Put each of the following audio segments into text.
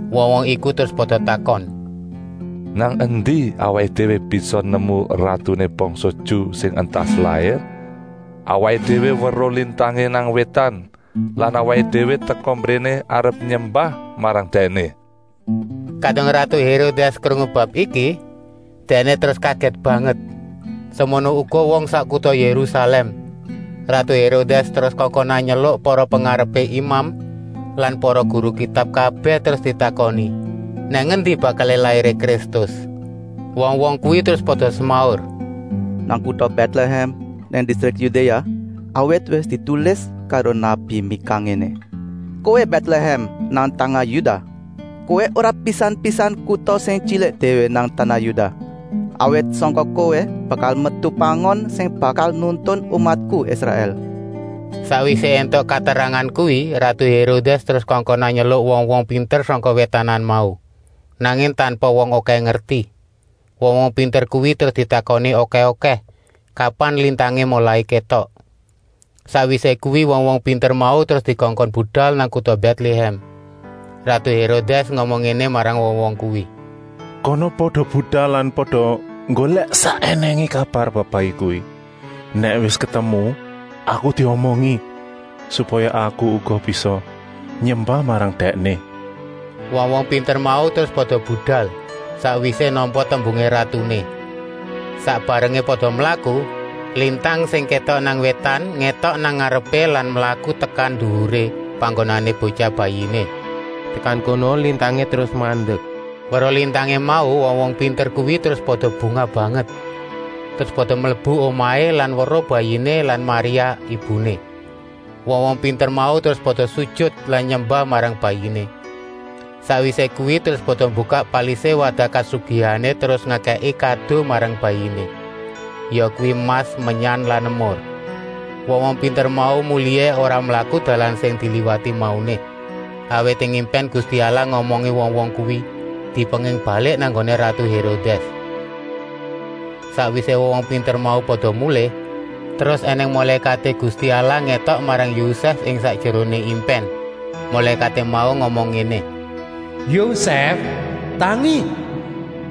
Wong-wong iku terus pada takon: “Nang endi awaké déwé bisa nemu ratuné bangsa Ju sing entas lair? Awaké déwé weruh lintangé nang wétan lan awaké déwé teka mbréné arep nyembah marang Dèkné.” Kadung ratu Hérodès krungu bab iki, dèkné terus kagèt banget, semono uga wong sak kuta Yérusalèm. Ratu Hérodès terus kongkonan nyeluk para pengarepé imam lan para guru Kitab kabèh terus ditakoni, nang endi bakalé lairé Kristus. Wong-wong kuwi terus pada semaur: “Nang kuta Bètlehèm nang distrik Yudéa, awit wis ditulis karo nabi Mika ngéné: ‘Kowé Bètlehèm nang tanah Yudah, kowé ora pisan-pisan kuta sing tyilik déwé nang tanah Yudah, awit sangka kowé bakal metu pangon sing bakal nuntun umatku Israèl.’” Sakwisé éntuk katerangan kuwi, ratu Hérodès terus kongkonan nyeluk wong-wong pinter sangka wétanan mau, nanging tanpa wong okèh ngerti. Wong-wong pinter kuwi terus ditakoni okèh-okèh, kapan lintangé molai kétok. Sakwisé kuwi wong-wong pinter mau terus dikongkon budal nang kuta Bètlehèm. Ratu Hérodès ngomong ngéné marang wong-wong kuwi: “Kana pada budal lan pada nggolèk sak ènèngé kabar bab Bayi kuwi. Nèk wis ketemu, aku diomongi, supaya aku uga bisa nyembah marang Dèkné.” Wong-wong pinter mau terus pada budal, sakwisé nampa tembungé ratuné. Sak barengé pada mlaku, lintang sing kétok nang wétan ngétok nang ngarepé lan mlaku tekan nduwuré panggonané Botyah Bayiné. Tekan kono lintangé terus mandek. Weruh lintangé mau, wong-wong pinter kuwi terus pada bungah banget. Terus pada mlebu omahé lan weruh Bayiné lan Maria, ibuné. Wong-wong pinter mau terus pada sujut lan nyembah marang Bayiné. Sakwisé kuwi terus pada mbukak palisé wadah kasugihané terus ngekèki kado marang Bayiné, yakuwi emas, menyan lan emur. Wong-wong pinter mau mulihé ora mlaku dalan sing diliwati mauné. Awit ing impèn Gusti Allah ngomongi wong-wong kuwi, dipenging balik nang nggoné ratu Hérodès. Sakwisé wong-wong pinter mau pada mulih, terus ènèng mulékaté Gusti Allah ngétok marang Yosèf ing sakjeroné impèn. Mulékaté mau ngomong ngéné: “Yosèf, tangi!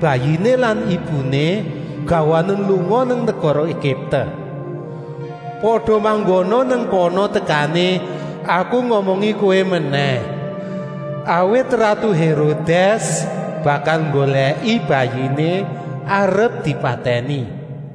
Bayiné lan ibuné gawanen lunga nang negara Egipte. Pada manggona nang kana tekané aku ngomongi kowé menèh. Awit ratu Hérodès bakal nggolèki Bayiné arep dipatèni.”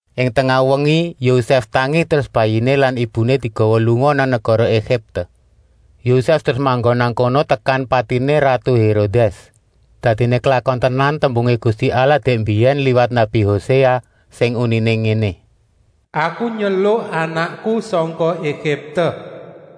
Ing tengah wengi Yosèf tangi, terus Bayiné lan ibuné digawa lunga nang negara Egipte. Yosèf terus manggon nang kono tekan patiné ratu Hérodès. Dadiné klakon tenan tembungé Gusti Allah dèk mbiyèn liwat nabi Hoséa sing uniné ngéné: “Aku nyeluk Anakku sangka Egipte.”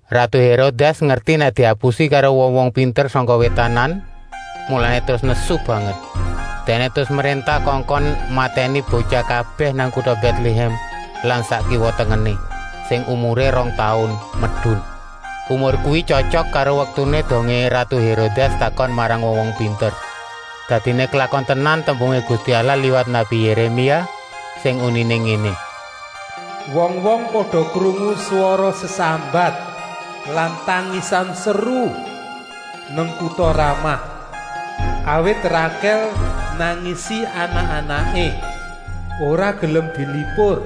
Ratu Hérodès ngerti nèk diapusi karo wong-wong pinter sangka wétanan, mulané terus nesu banget. Dèkné terus mréntah kongkon matèni botyah kabèh nang kuta Bètlehèm lan sak kiwa-tengené, sing umuré rong taun medun. Umur kuwi tyotyok karo waktuné dongé ratu Hérodès takon marang wong-wong pinter. Dadiné klakon tenan tembungé Gusti Allah liwat nabi Yéremia, sing uniné ngéné: “Wong-wong pada krungu swara sesambat lan tangisan seru nang kuta Ramah; awit Rakèl nangisi anak-anaké; ora gelem dilipur,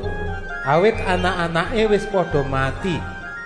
awit anak-anaké wis pada mati.”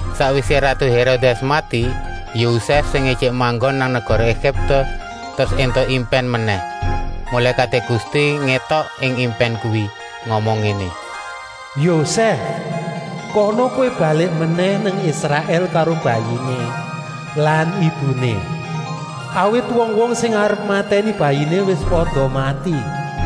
Sakwisé ratu Hérodès mati, Yosèf, sing ijik manggon nang negara Egipte, terus éntuk impèn menèh. Mulékaté Gusti ngétok ing impèn kuwi, ngomong ngéné: “Yosèf, kana kowé balik menèh nang Israèl karo Bayiné lan ibuné, awit wong-wong sing arep matèni Bayiné wis pada mati.”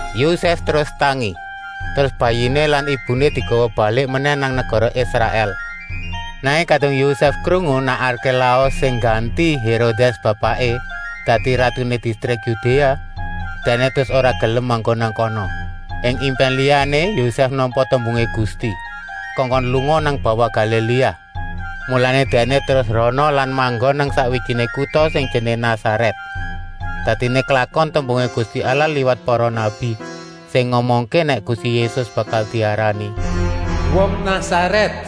Yosèf terus tangi, terus Bayiné lan ibuné digawa balik menèh nang negara Israèl. Nanging kadung Yosèf krungu nèk Arkélaus sing ngganti Hérodès, bapaké, dadi ratuné distrik Yudéa, dèkné terus ora gelem manggon nang kana. Ing impèn liyané Yosèf nampa tembungé Gusti, kongkon lunga nang bawah Galiléa. Mulané dèkné terus rana lan manggon nang sakwijiné kuta sing jenengé Nasarèt. Dadiné klakon tembungé Gusti Allah liwat para nabi, sing ngomongké nèk Gusti Yésus bakal diarani “Wong Nasarèt.”